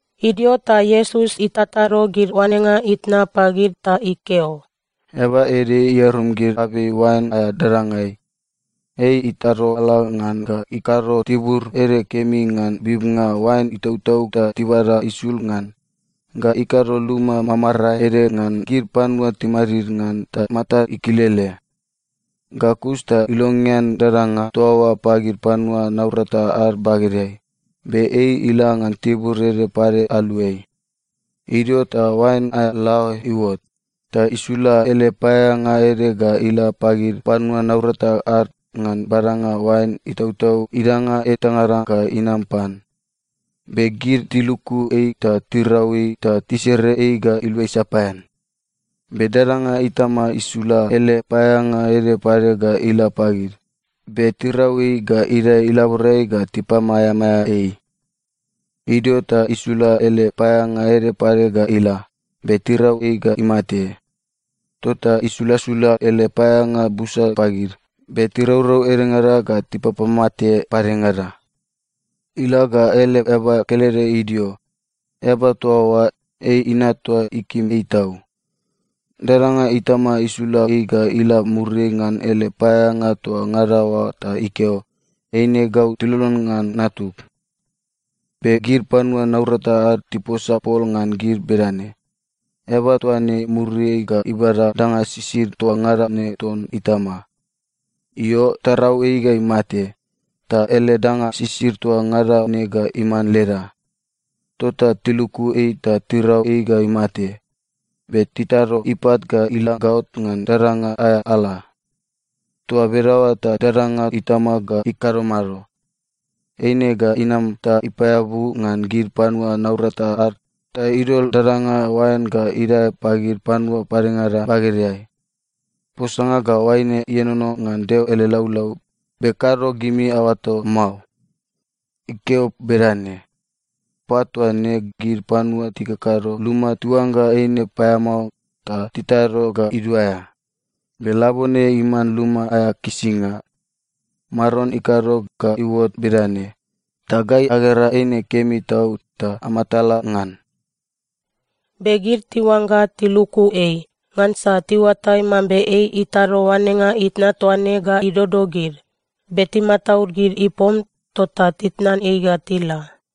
Idio ta Iesus itatado gid oanenga itna pagid ta ikeo, “Eaba ede iarum gid abei oain aea dadangai. Ei itado ala ngan ga ikado tibur ede kemi ngan bibnga oain itautau ta tibada isul ngan. Ga ikado luma mamarae ede ngan gid panua timadid ngan ta matad ikilele. Ga kus ta ilongean dadanga toa oa pagid panua naurata ad bagedeai, be ei ila ngan tibur ede pade aluai. “Idio ta oain aea laoe iuot, ta isula ele paeaeanga ede ga ila pagid panua naurata ad ngan badanga oain itautau idanga etangada ga inam pan. Be gid tiluku ei ta tirau ei ta tisere ei ga iluai sapaean. Be dadanga itama isula ele paeaeanga ede pade ga ila pagid, be tirau ei ga idae ilaborai ga tipamaeamaea ei. Idio ta isula ele paeaeanga ede pade ga ila, be tirau ei ga imate. Tota isulasula ele paeaeanga busa pagid, be tiraurau edengada ga tipapamate padengada. “Ila ga ele eaba kelede idio. Eaba toa oa, ei inat toa ikim ei tau. Dadanga itama isula ei ga ila muriai ngan ele paeaeanga toa ngada oa ta ikeo, ‘Eine ga tilolon ngan natug.’ “Be gid panua naurata ad tiposa pol ngan gid bedane, ‘Eaba toa ne muriai ga ibada danga sisid toa ngada ne ton itama. Io, tarau ei ga imate. Ta ele danga sisid toa ngada ne ga iman leda!’ Tota tiluku ei ta tirau ei ga imate. Be titado ipat ga ila gaot ngan dadanga aea ala. “Toa bedaoa ta dadanga itama ga ikado mado? Eine ga inam ta ipaeabu ngan gid panua naurata ad ta idol dadanga oain ga idae pagid panua padengada bagedeai. Posanga ga oaine ienono ngan Deo ele laulau, be kado gimi aoato mao? Ikeo bedane, “‘Pat toa ne, gid panua tikakado luma tiuangga eine paeamao ta titado ga iduaea. Be labone iman luma aea kisinga. Maron ikado ga iuot bedane, ta gai agera eine kemi tau ta amatala ngan.’” Be gid tiuangga tiluku ei, ngansa tiuatai mambe ei itado oanenga itna toa ne ga idodo gid. Be timataud gid ipom, tota titnan ei ga tila.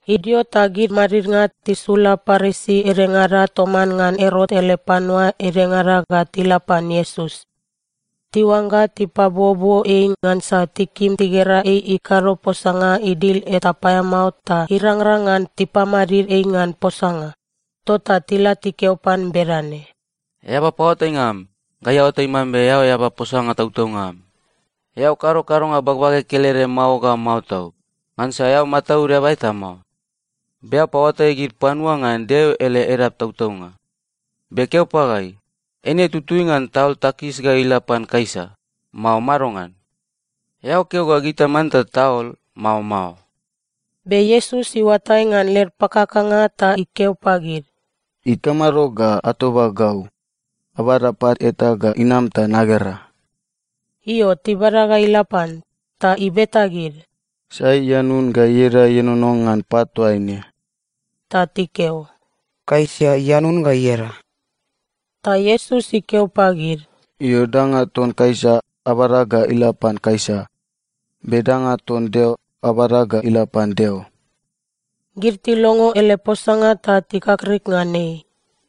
Idio ta gid madidnga tisula Parisi edengada toman ngan Erot ele panua edengada ga tila pan Iesus. Tiuangga tipabuobuo ei ngansa tikim tigera ei ikado posanga idil eta paeamao ta irangrang ngan tipamadid ei ngan posanga. Tota tila tikeo pan bedane, “Eaba paoatainga am, gai aoatai mambe eao eaba posanga tautaunga am. Eao kado kadonga bagbage kelede mao ga mao tau, ngansa eao mataud eaba eta mao. Be eao papaoatai gid panua ngan Deo ele edap tautaunga. Be keo pagai, eine tutui ngan taol takis ga ila pan Kaisa, mao madongan? Eao keo ga gita manta taol, mao mao?” Be Iesus iuatai ngan led pakakanga ta ikeo pagid, “Ikamado ga atoba gau? Abada pat eta ga inam ta nagera!” Io, tibada ga ila pan, ta ibeta gid, “Sai ianun ga ieda ienono ngan pat toa ne?” Ta tikeo, “Kaisa ianun ga ieda.” Ta Iesus ikeo pagid, “Io, danga ton Kaisa, abada ga ila pan Kaisa, be danga ton Deo, abada ga ila pan Deo.” Gid tilongo ele posanga ta tikakrik ngan ei.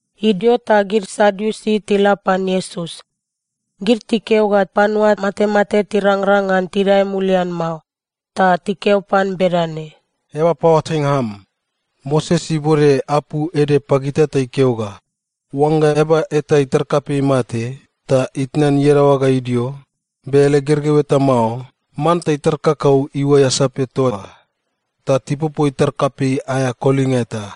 Idio ta gid Sadiusi tila pan Iesus. Gid tikeo ga panua matemate tirangrang ngan tidae mulian mao. Ta tikeo pan bedane, “Eaba paoatainga am, Moses ibode apu ede pagita ta ikeo ga, ‘Oangga eaba eta itar kapei imate ta itnan iadaoa ga idio, be ele gergeu eta mao, manta itar kakau iuai asape toa oa ta tipopo itar kapei aea kolinga eta.’”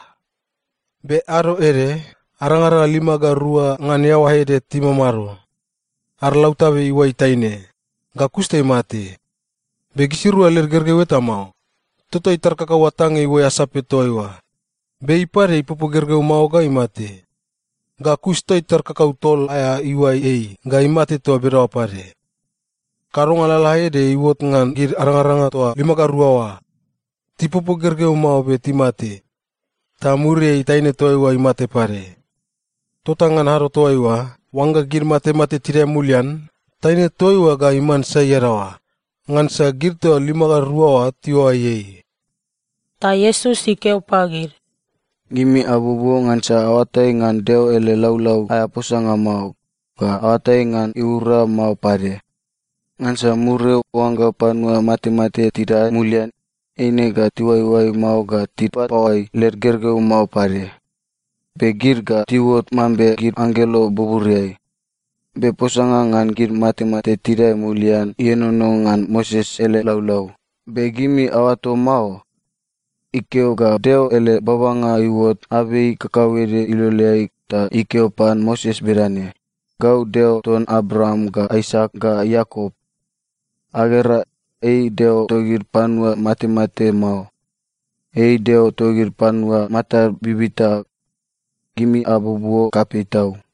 “Be ado ede, arangaranga lima ga rua ngan iaoa ede timamado. Ad lautabe iuai taine, ga kus ta imate, be gisirua led gergeu eta mao. Tota itar kakau atange iuai asape toa oa, be ei pade ipopo gergeu mao ga imate. Ga kus ta itar kakau tol aea iuai ei ga imate toa bedaoa pade. Kadonga lalaede iuot ngan gid arangaranga toa lima ga rua oa. Tipopo gergeu mao be timate. Ta muriai taine toa oa imate pade. Tota ngan ado toaiua, oangga gid matemate tidae mulian, taine toa oa ga iman sai iadaoa? Ngansa gid toa lima ga rua oa tiuai ei.” Ta Iesus ikeo pagid, “Gimi abuobuo ngansa aoatai ngan Deo ele laulau aea posanga mao, ga aoatai ngan iura mao pade. Ngansa muriai, oangga panua matemate tidae mulian, eine ga tiuaioai mao ga tipapaoai led gergeu mao pade. Be gid ga tiuot mambe gid anggelo buburiai. Be posanga ngan gid matemate tidae mulian ienono ngan Moses ele laulau, be gimi aoato mao? Ikeo ga Deo ele babanga iuot abei kakauede iloleai ta ikeo pan Moses bedane, ‘Gau Deo ton Abraam ga Aisak ga Iakop.’ Agera, ei Deo togid panua matemate mao. Ei Deo togid panua matad bibita. Gimi abuobuo kapei tau.”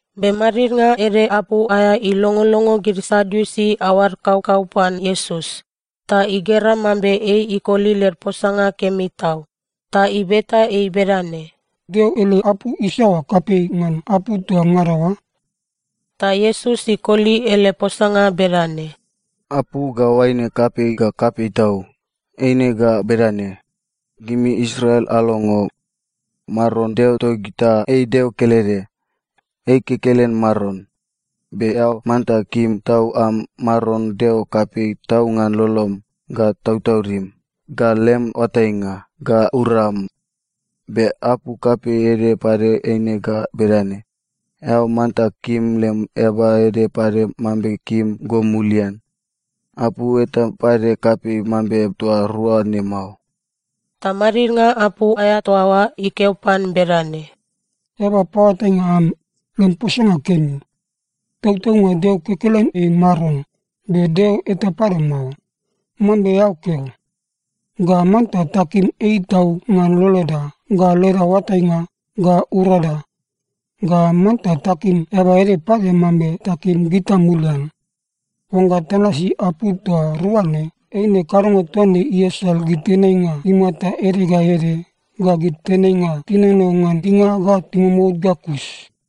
Be madidnga ede apu aea ilongolongo gid Sadiusi aoad kaukau pan Iesus, ta igera mambe ei ikoli led posanga kemi tau, ta ibeta ei bedane, “Deo ele apu isaoa kapei ngan apu toa ngada oa?” Ta Iesus ikoli ele posanga bedane, “Apu ga oaine kapei ga kapei tau. Eine ga bedane, ‘Gimi Israel alongo! Maron Deo togita ei Deo kelede. Ei kekelen Maron. Be eao manta kim tau am Maron Deo kapei tau ngan lolom, ga tautaudim, ga lem oatainga, ga uram.’ Be apu kapei ede pade eine ga bedane, ‘Eao manta kim lem eaba ede pade mambe kim go mulian.’ Apu eta pade kapei mambe toa rua ne mao.” Ta madidnga apu aea toa oa ikeo pan bedane, “Eaba paoatainga am, lem posanga kemi. Tautaunga Deo kekelen ei Maron, be Deo eta pade mao, mambe eao keo. Ga manta takim ei tau ngan loloda, ga leda oatainga, ga urada. Ga manta takim eaba ede pade mambe takim gita mulian. Oangga tanasi apu toa rua ne, eine kadonga toa ne iasal gid tenainga imata ede ga ede ga gid tenainga tinono ngan dinga ga imomout ga kus.”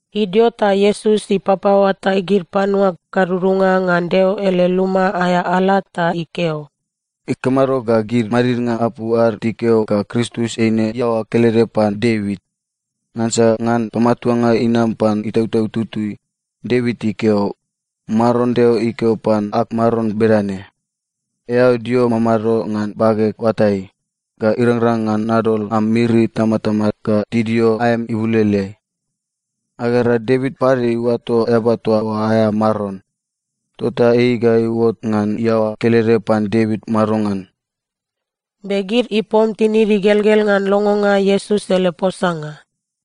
Idio ta Iesus ipapaoatai gid panua gadudunga ngan Deo ele luma aea ala ta ikeo, “Ikamado ga gid madidnga apu ad tikeo ga Kristus eine iaoa kelede pan Devit? Ngansa ngan pamatuanga inam pan Itautau Tutui, Devit ikeo, “‘Maron Deo ikeo pan ag Maron bedane: “Eao dio mamado ngan bageg oatai, ga irangrang ngan nadol am miri itamatama ga tidio aem ibuloloeai.” ’ Agera, Devit pade iuato eaba toa oa aea Maron. Tota ei ga iuot ngan iaoa kelede pan Devit madongan?” Be gid ipom tinid igelgel ngan longonga Iesus ele posanga.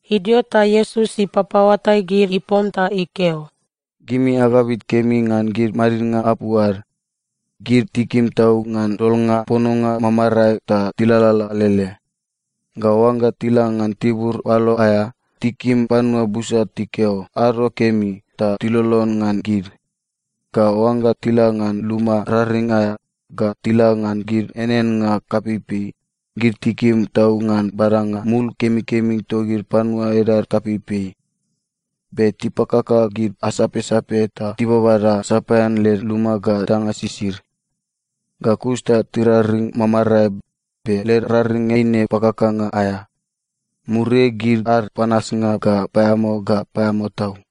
Idio ta Iesus ipapaoatai gid ipom ta ikeo, “Gimi agabit kemi ngan gid madidnga apu ad. Gid tikim tau ngan dolnga pononga mamarae ta tilalala alele. Ga oangga tila ngan tibur oalo aea, tikim panua busa tikeo ‘ado kemi’ ta tilolon ngan gid. Ga oangga tila ngan luma raring aea, ga tila ngan gid eaneannga kapeipei, gid tikim tau ngan badanga mul kemikemi togid panua edad kapeipei. Be tipakaka gid asapsape ta tibabada sapaean led luma ga danga sisid. Ga kus ta tiraring mamarae, be led raring eine pakakanga aea. Muriai gid ad panasnga ga paeamao ga paeamao tau.”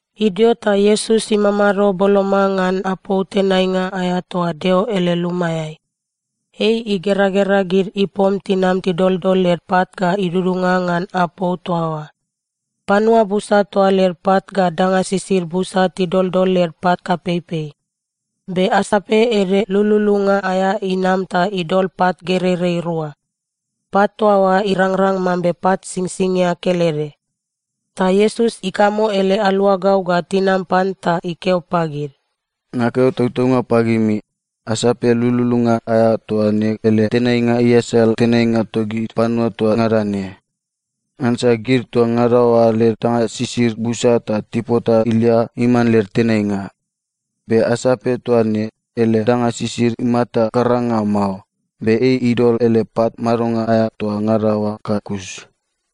Idio ta Iesus imamado boloma ngan apou tenainga aea toa Deo ele lumaeai. Ei igeragera gid ipom tinam tidoldol led pat ga idudunga ngan apou toa oa. Panua busa toa led pat ga danga sisid busa tidoldol led pat kapeipei. Be asape ede lululunga aea inam ta idol pat gereirei rua. Pat toa oa irangrang mambe pat singsingia kelede. Ta Iesus ikamo ele aluagau ga tinam pan ta ikeo pagid, “Nakeo tautaunga pagimi, asape lululunga aea toa ne ele tenainga iasal tenainga togid panua toa ngada ne. Ngansa gid toa ngada oa led danga sisid busa ta tipota ilia iman led tenainga. Be asape toa ne, ele danga sisid imata karanga mao, be ei idol ele pat madonga aea toa ngada oa ga kus.”